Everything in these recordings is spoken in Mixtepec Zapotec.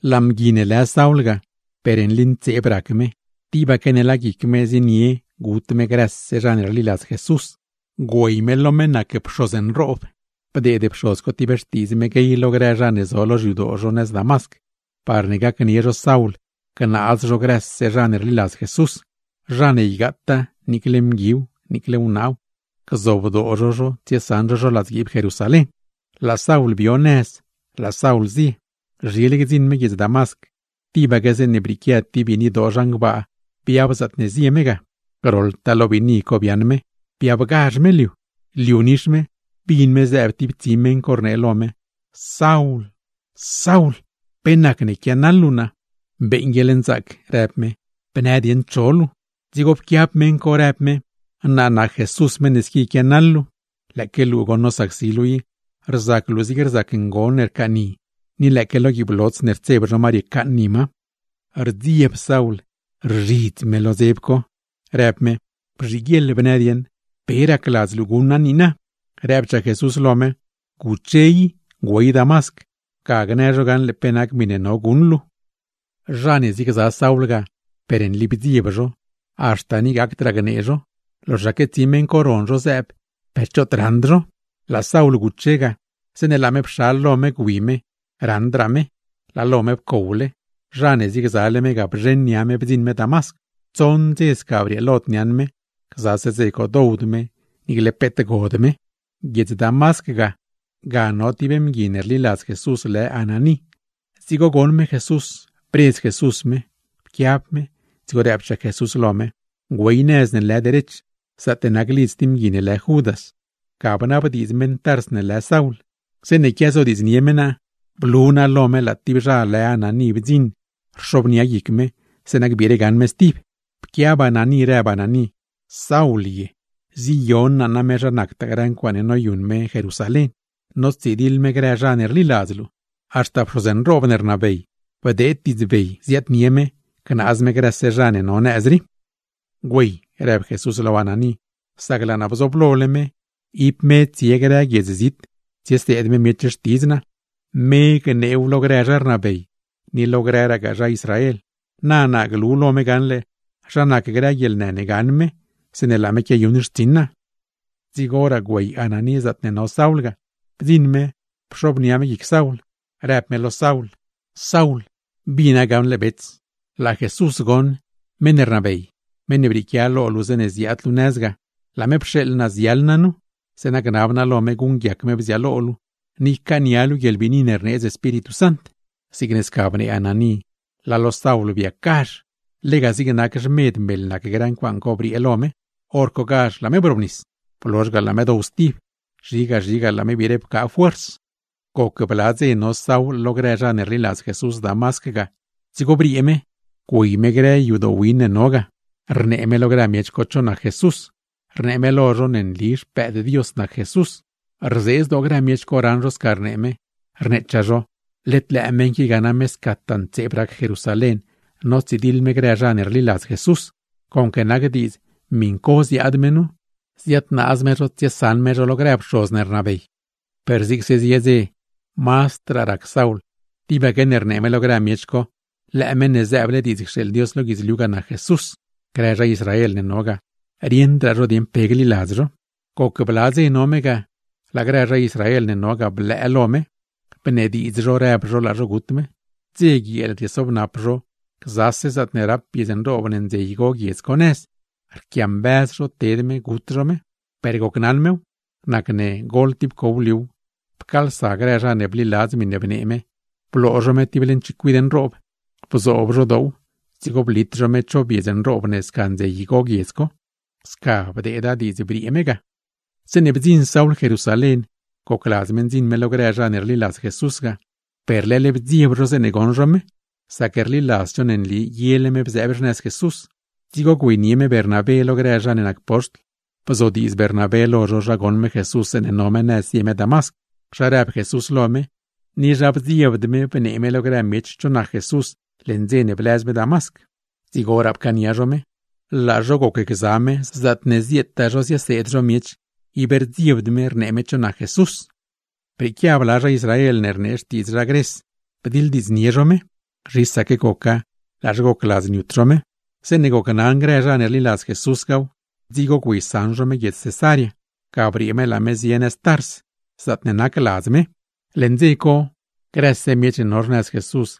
Laa mgui ne lë Saul ga, per nli ntseeb rac me, tibaque ne laa guic me zienie gut me grëse zha ne rliladz Jesús. Güey me lo meṉ ne nac pxoz nroob, bdeed pxoz co ti xtiidz me guey lo grë zha ne zo lo xyadoo zho nëz Damasc, parne gacnie zho Saul gnaaz zho grëse zha ne rliladz Jesús; zha ne ygaataa niicle mguiw niicle wnaaw, gzobdoo zho zho tsiesaṉ zho ladzguiib Jerusalén. Laa Saul bio nëz, laa Saul zie. Zhile gdziṉ me guiedz Damasc, tibaque zeeṉe brieequia ti biinidoo zhan gbaa biab zaatne zie me ga. Groḻtaa lo biinidoo co biaaṉ me, biabgazh me liu. Liu nix me, bin me zëëb ti tsi meṉ co rnee lo me: ―Saul, Saul, ¿pe nacne quianaḻ luu naa? ―Beeṉ guieḻnzaac ―rëb me―, bnë dieṉ cho luu. Dzigo pquiab meṉ co, rëb me: ―Naa nac Jesús meṉ ne squi quiatsidiḻ luu. [Lëëque luu goṉ nosacsi luu i, rzac luu zigne rzac ngon ne rcaaṉni, ni lëëque lo guiib lots ne rtseb zho ma riecaaṉni ma. Rdzieb Saul, rzhidz me lo dzeb co rëb me: ―Bzhiguieḻ bnë dieṉ, ¿pe racladz luu guṉ naa niina?] Rëbchaa Jesús lo me: ―Guche i, güey Damasc, ga gnë zho gaṉle pe nac miṉe no guṉ luu. Zha ne ziegza Saul ga per nli bdzieb zho, haxta ni gacdraa gnee zho; loxaque tsi meṉ co ron zho zëëb, per choot raṉd zho. Laa Saul guche ga. Zeeṉe laa me pxal lo me gwi me raṉdraa me, ¡laa lo me pcowle! Zha ne ziegzale me ga bzheṉ nia me bdziṉ me Damasc. Tsoṉ dze sca brieelod niaṉ me, gzase dze co dowd me, niicle peet god me. Guiedz Damasc ga, ga no ti mgui ne rliladz Jesús lë Ananí; dzigo goṉ me Jesús, bredz Jesús me. Pquiab me, dzigo rëbchaa Jesús lo me: ―Güey nëz ne lë Derech, zaatne nac lidz ti mgui lë Judas; ga bnabdiidz meṉ Tars ne lë Saul. Zeeṉe quiazodiidznie me naa, blu naa lo me laa tib zha lë Ananí bdziṉ rxobnia guic me, zeeṉa gbiire gaṉ me stib. Pquiab Ananí rëb Ananí: ―¿Saul ye? Ziyon naa name zha nac grëtaa ncuaaṉe noyuṉ me Jerusalén, notsidiḻ me grë zha ne rliladz luu. Haxta pxoz nroob ne rnabey bdeed diidzbey gnaaz me grëse zha ne no nëz rii. ―Güey ―rëb Jesús lo Ananí―, sac laa naa bzooblole me, ib me tsie grë guiedz zit tsieseed me miech xtidz naa, me gneew lo grë zha rnabey, ni lo grëgaa zha Israel. Na naa glu lo me gaṉle zha nac grë guieḻnë ne gaṉ me, zeeṉe laa me quiayuṉle xtsiṉ naa. Dzigoraa güey Ananí zaatne no Saul ga. Bdziṉ me, pxobnia me guic Saul, rëb me lo Saul: ―Saul, bina gaṉle bets, laa Jesús goṉ, meṉ ne rnabey, meṉ ne brieequia lo luu zeeṉe ziaad luu nëz ga, laa me pxeeḻ naa ziaḻ naa nu; zeeṉa gnab naa lo me guṉguiac me bziaalo luu, ni ycaania luu guieḻbiini ne rneedz Espíritu Sant. Zigne sca bnee Ananí, laa lo Saul biacgazh; lega zigne nac xmed meḻ nac grë ncuaaṉ co briee lo me. Horcogazh laa me brobnis. Blozh ga laa me dow stib, zhiga zhiga laa me wbire pcaa fuerz. Goc bla dze no Saul lo grë zha ne rliladz Jesús Damasc ga, dzigo briee me güey me grë yadoo win ne no ga, rnee me lo grë miech co cho nac Jesús, rnee me lo zho ne nli Xpëëd Dios nac Jesús. Rzee zdoo grëse miech co raṉ zho sca rnee me, rneechaa zho: ―¿Led lëë meṉ qui ga name scataa ntseeb rac Jerusalén, notsidiḻ me grë zha ne rliladz Jesús? Conque nac diidz miṉ co ziaad me nu, ziadnaaz me zho tsiesaṉ me zho lo grë pxoz ne rnabey. Per zigse zie dze, mazdraa rac Saul tibaque ne rnee me lo grë miech co, lëë meṉ ne zëëble diidz cxeeḻ Dios lo guidzliu ga, nac Jesús. Grë zha Israel ne no ga, rieṉdraa zho dieṉ pe gliladz zho. Goc bla dze no me ga, laa grë zha Israel ne no ga blëë lo me; bnediidz zho rëb zho laa zho gut me. Dze guieel riesobnap zho gzaase zaatne rap biedz nroob ne ndze igo guiedz co nëz, riequiambëz zho ted me, gut zho me. Per gocnaṉ mew, nacne goḻ ti pcow liu pcaalsa grë zha ne bliladz miṉe bnee me, bloo zho me ti leṉ chicuid nroob, bzoob zho doow dzigo blit zho me cho biedz nroob ne sca ndze igo guiedz co. Sca bdeeda diidz briee me ga. Zeeṉe bdziṉ Saul Jerusalén gocladz me ndziṉ me lo grë zha ne rliladz Jesús ga, per leḻ bdzieb zho zeeṉe goṉ zho me, sac rliladzd zho ne nli yele me bzëëb xnëz Jesús. Dzigo güeynie Bernabé me lo grë zha ne nac poxtl, bzodiidz Bernabé lo zho zha goṉ me Jesús zeeṉe no me nëz zie me Damasc, zha rëb Jesús lo me; ni zha bdziebd me bnee me lo grë miech cho nac Jesús, leṉ dze ne blëz me Damasc. Dzigoraa pcaania zho me. Laa zho gocgza me, zaatne zietaa zho zieseed zho miech, ib rdziebd me rnee me cho nac Jesús. Brieequia bla zha Israel ne rnee xtiidz zha Gres bdiḻdiidznie zho me. Zhisaque goca, laa zho gocladz niut zho me. Zeeṉe gocnaṉ grë zha ne rliladz Jesús gaw, dzigo güeysaṉ zho me guiedz Cesarea; ga briee me laa me zie nëz Tars, zaatne nac ladz me. Leṉ dze co, grëse miech ne no xnëz Jesús,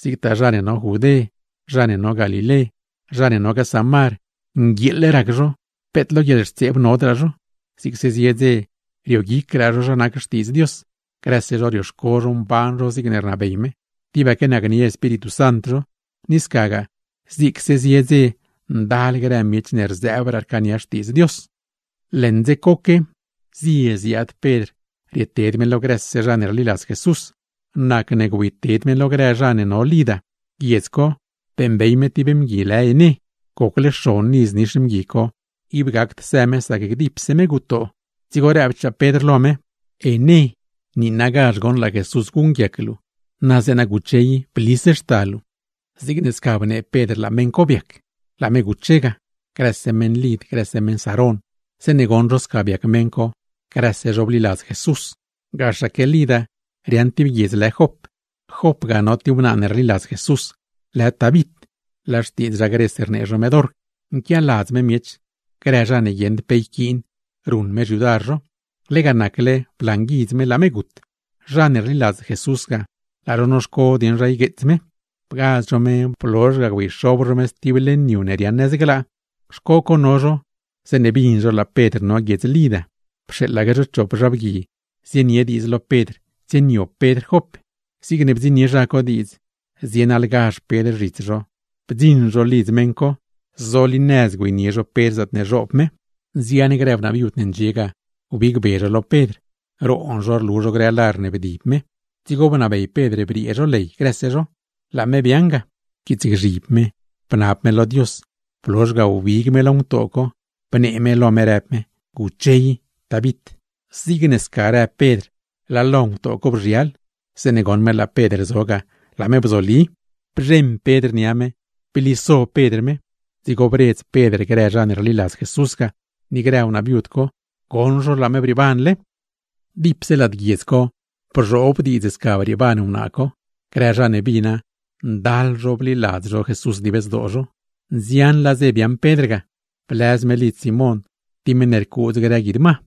zigtaa zha ne no Judé, zha ne no Galilé, zha ne nogaa Samar, nguieeḻ rac zho peet lo guieḻxtseeb nodraa zho; zigse zie dze rioguicraa zho zha nac Xtiidz Dios. Grëse zho rioxco zho mban zho zigne rnabey me, tibaque nacnie Espíritu Sant zho. Ni scagaa, zigse zie dze ndal grë miech ne rzëëbraa rcaania Xtiidz Dios. Leṉ ngbidz coque, zie ziaad Pedr rieted me lo grëse zha ne rliladz Jesús. Nacne güeyted me lo grë zha ne no Lida. Guiedz co, beeṉbey me ti mgui lë Ené, gocle xon iz nix mgui co, ib gacd së me sac dipse me gutoo. Dzigo rëbchaa Pedr lo me: ―¡Ené, niinagazh goṉ laa Jesús guṉguiac luu! Na zeeṉ guche i blis xta luu. Zigne sca bnee Pedr laa meṉ co biac, laa me guche ga. Grëse meṉ Lida, grëse meṉ Sarón zeeṉe goṉ zho sca biac meṉ co, grëse zho bliladz Jesús. Gaxaque Lida riaaṉ ti guiedz lë Jop. Jop ga no ti wnaa ne rliladz Jesús, lë Tabit (laa xtiidz zha Gres rnee zho me Dorc). Nquialadz me miech, grë zha ne guieṉd pe yquiin, ruṉ me xyudar zho. Lega nacle blanguidz me, laa me gut. Zha ne rliladz Jesús ga, laa zho noxco dieṉ zha ygueets me. Bgaz zho me, blozhse ga güeyxob zho me sti leṉ yu ne riaaṉ nëz glaa. Xco co no zho, zeeṉe bin zho laa Pedr no Lida. Pxeeḻaque zho chop zha bgui zienie diidz lo Pedr tsieniob Pedr Jop. Zigne bdziṉnie zha co diidz, zienaḻgazh Pedr zhits zho. Bdziṉ zho lidz meṉ co, zolinëz güeynie zho Pedr zaatne zhoob me. Nzian grë wnaa viud ndxie ga, wbigbe zho lo Pedr, roon zho rlu zho grë lar ne bdib me. Dzigo bnabey Pedr briee zho ley grëse zho, laa me biaaṉ ga, pquiitsgzhib me bnab me lo Dios. Blozhse ga wbig me lo ngutoo co, bnee me lo me rëb me: ―Guche i, Tabit. Zigne sca rëb Pedr laa lo ngutoo co bzhial, zeeṉe goṉ me laa Pedr zo ga, laa me bzobli. Bzheṉ Pedr nia me, bliso Pedr me, dzigo bredz Pedr grë zha ne rliladz Jesús ga, ni grë wnaa viud co; goṉ zho laa me brieebanle. Dipse lad guiedz co bzhoob diidz sca brieeban wnaa co; grë zha ne bina, ndal zho bliladz Jesús dib zdoo zho. Nzianlaa dze biaaṉ Pedr ga, blëz me lidz Simón ti meṉ ne rcuudz grë guid ma.